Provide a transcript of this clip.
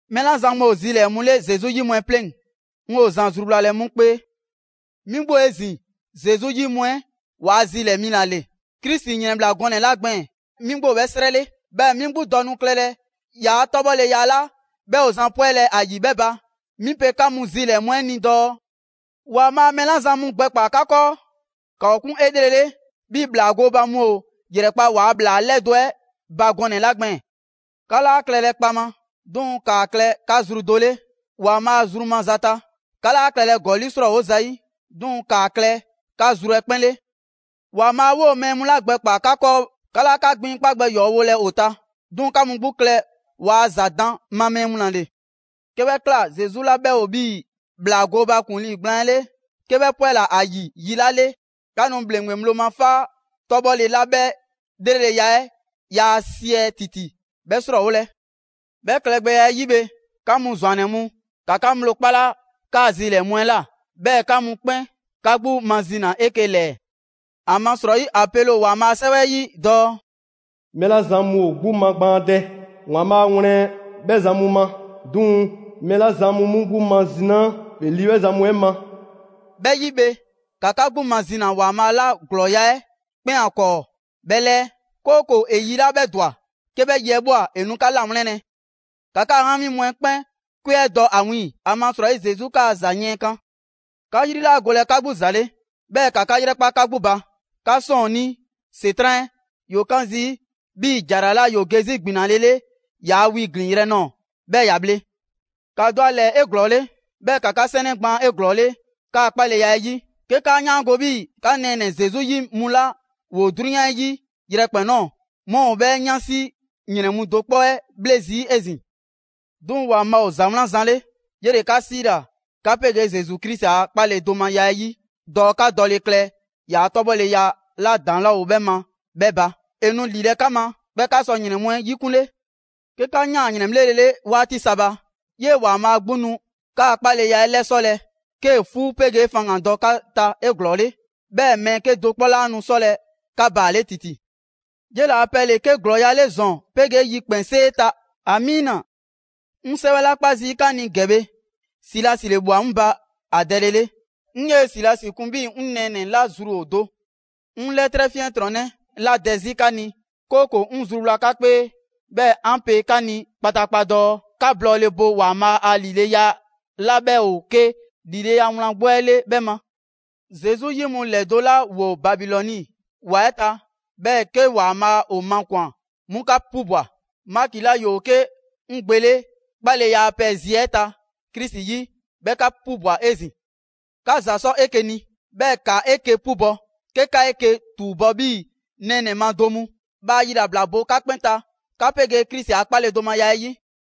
Mɛɛ 'la zan mu ‑o zilɛɛ‑ mu 'le Zesu 'yi mu 'ɛ 'pleŋ‑, 'ŋ 'yoo‑ zan zruwlalɛ 'mu 'kpee. 'Mi 'gbu ‑o 'ezin‑ Zesu 'yi mu 'ɛ waa zilɛɛ‑ mi ‑la ‑le. Krisi ‑yrɛnbhla gɔnɛ‑ 'la gbɛɛn‑ 'mi 'gbu ‑o 'bhɛ 'srɛ 'le. 'Bhɛɛ‑ 'mi 'gbu dɔ nu klɛlɛ ‑yaa' 'tɔbhɔleya 'la 'bhɛ ‑o zan 'pwɛlɛ‑ ‑a ‑yi 'bhɛ ba. 'Mi pe 'ka mu zilɛɛ‑ mu 'ɛ ni dɔɔ: ‑Waanbhaa' mɛɛ 'la zan mu gbɛkpaa‑ 'ka 'kɔɔ, ‑ka ‑o 'kun 'elrele 'bhii‑ ‑bhlaa gooba mu ‑o ‑yrɛkpa' ‑waa' ‑bhlaa 'lɛdo‑ 'ɛ ba gɔnɛ‑ 'la gbɛɛn‑. 'Ka 'laa klɛlɛ kpaŋma; 'duŋ‑ ‑kaa klɛ 'ka zru ‑dɔɔ 'le ‑Waanbhaa zru maza ta. 'Ka 'laa klɛlɛ ‑gɔli' 'srɔɔwo zayi'; 'duŋ‑ ‑kaa klɛ 'ka zru 'ɛ 'kpɛn 'le. ‑Waanbhaa' 'woo‑ mɛɛ mu 'la gbɛkpaa‑ 'ka 'kɔɔ, 'ka 'laa 'ka gbiŋkpa' gbɛ ‑yɔɔ' wolɛ ‑o ta, 'duŋ‑ 'ka mu 'gbu klɛ ‑waa' ‑za daan ma mɛɛ mu 'le. 'Ke 'bhɛ ꞊kla, Zesu 'la 'bhɛ ‑o 'bhii‑ ‑bhlaa gooba ‑kuŋlii gblaan 'ɛ 'le, 'ke 'bhɛ 'pwɛla‑ ‑a ‑yi yi 'la 'le, 'ka nu ‑bhleŋgbe ŋgblo ma 'faa 'tɔbhɔle 'la 'bhɛ 'lreleya 'ɛ yaa siɛ ‑titi, 'bhɛ 'srɔɔwolɛ. 'Bhɛ klɛgbɛya 'ɛ 'yi bhe, 'ka mu ‑zwannɛ mu, ‑ka 'ka ŋgblo 'kpala 'kaa‑ zilɛɛ‑ mu 'ɛ ꞊la. 'Bhɛɛ‑ 'ka mu 'kpɛn, 'ka 'gbu mazina 'eke‑ ‑lɛɛ. ‑Amasrɔyi ‑a pele ‑o ‑Waanbhaa' a 'sɛwɛ 'ɛ 'yi dɔɔ: «Mɛɛ 'la zan mu ‑o 'gbu magbaandɛ, ‑Waanbhaa' wlɛn 'bhɛ zan mu ma. 'Duŋ‑ mɛɛ 'la zan mu 'mu 'gbu mazinaa, ‑e ‑li 'bhɛ zan mu 'ɛ ma.» 'Bhɛ 'yi bhe, ‑ka 'ka 'gbu mazina ‑Waanbhaa' 'la ‑glɔɔya' 'ɛ 'kpɛn ‑o ‑a 'kɔɔ 'bhɛ 'lɛɛ; 'kooko‑ ‑e yi 'la 'bhɛ ‑dwa 'ke 'bhɛ yi 'ɛ ꞊bwa, ‑e nu 'ka 'lawlɛnlɛ. ‑Ka 'kaa 'ŋgami mu 'ɛ 'kpɛn 'kwe 'ɛ dɔ ‑a wiiŋ‑, ‑amasrɔyi Zesu 'kaa‑ ‑za yiɛnkan. 'Ka 'yri 'laa golɛ 'ka 'gbu ‑za 'le, 'bhɛɛ‑ ‑ka 'ka 'yrɛkpa 'ka 'gbu ba! 'Ka 'sɔɔnnii ‑Setran' 'ɛ, ‑yoo 'kaan zii' 'bhii‑ ‑jara 'la ‑yoo ge 'zi gbinalele ‑yaa' wi ‑glinyrɛ' nɔɔ‑, 'bhɛɛ‑ ‑ya bhle. ‑Ka dɔ ‑a ‑lɛɛ 'eglɔɔle, 'bhɛɛ‑ ‑ka 'ka 'sɛnɛ gbaan 'eglɔɔle 'kaa‑ 'kpaleya 'ɛ 'yi; 'ke 'kaa 'yaango‑ 'bhii‑ 'ka nɛɛnɛ‑ Zesu 'yi mu 'la ‑woo 'drunyan 'ɛ 'yi yrɛkpɛn‑ ꞊nɔɔ 'mu ‑o 'bhɛɛ‑ 'yansi ‑yrɛn mu do 'kpɔ 'ɛ 'bhle zii' 'ezin‑. 'Duŋ‑ ‑Waanbhaa' ‑o ‑za 'wlan zan 'le. 'Yele‑ 'ka 'siila‑ 'ka 'pegee Zesu Krisi a 'kpaledomaya 'ɛ 'yi dɔɔ 'ka dɔ klɛ ‑yaa' 'tɔbhɔleya 'la ‑daŋ' 'laa ‑o 'bhɛ ma 'bhɛ ba. ‑E nu ‑lilɛ' 'ka ma, 'bhɛɛ‑ 'ka sɔ ‑yrɛn mu 'ɛ 'yikunle. 'Ke 'ka ꞊yaan ‑yrɛnbhlele 'waati sa ba, 'yee‑ ‑Waanbhaa' 'gbu nu 'kaa‑ 'kpaleya 'ɛ 'lɛsɔlɛ 'kee‑ 'fuu 'pegee faŋgandɔ 'ka ta 'eglɔɔle; 'bhɛɛ‑ mɛɛ 'kedo‑ 'kpɔ 'laa nu 'sɔlɛ‑ 'ka baale' ‑titi. 'Yela‑ a pɛ ‑le 'ke ‑glɔɔya' 'le ‑zɔn 'pegee yikpɛnsee ta! ‑Amiina. 'Ŋ 'sɛwɛ 'la 'kpa zii' 'ka ni ‑gɛ bhe, Silasi ‑le ꞊bhwa 'ŋ ba ‑a dɛlele 'le. 'Ŋ 'yee‑ Silasi kun 'bhii‑ 'ŋ nɛɛnɛ‑ 'la zru ‑o do. 'Ŋ 'lɛtrɛ 'fiɛntrɔnnɛ ‑la dɛ 'zi 'ka ni, 'kooko‑ 'ŋ zruwla 'ka 'kpee, 'bhɛɛ‑ 'an pe 'ka ni kpataakpa dɔɔ 'ka blɔɔle bo ‑Waanbhaa' a ‑lileya 'la 'bhɛ ‑o 'ke ‑lileya wlan 'gbu 'ɛ 'le 'bhɛ ma. Zesu 'yi mu ‑lɛdo' 'la ‑woo Babilɔni ‑wa 'ɛ ta, 'bhɛɛ‑ 'ke ‑Waanbhaa' ‑o makwan‑ 'mu 'ka 'pubwa‑. Maki 'la ‑yoo 'ke 'ŋ gbe 'le 'kpaleya a pɛ zi 'ɛ ta Krisi 'yi, 'bhɛ 'ka 'pubwa‑ 'ezin‑. 'Ka ‑za 'sɔ 'eke‑ ni, 'bhɛɛ‑ ‑ka 'eke‑ 'pubɔ‑ 'ke 'ka 'eke‑ ‑tuubɔ' 'bhii‑ nɛɛnɛ‑ ma do mu. Bhaa yilabla bo 'ka 'kpɛn ta 'ka 'pegee Krisi a 'kpaledomaya 'ɛ 'yi!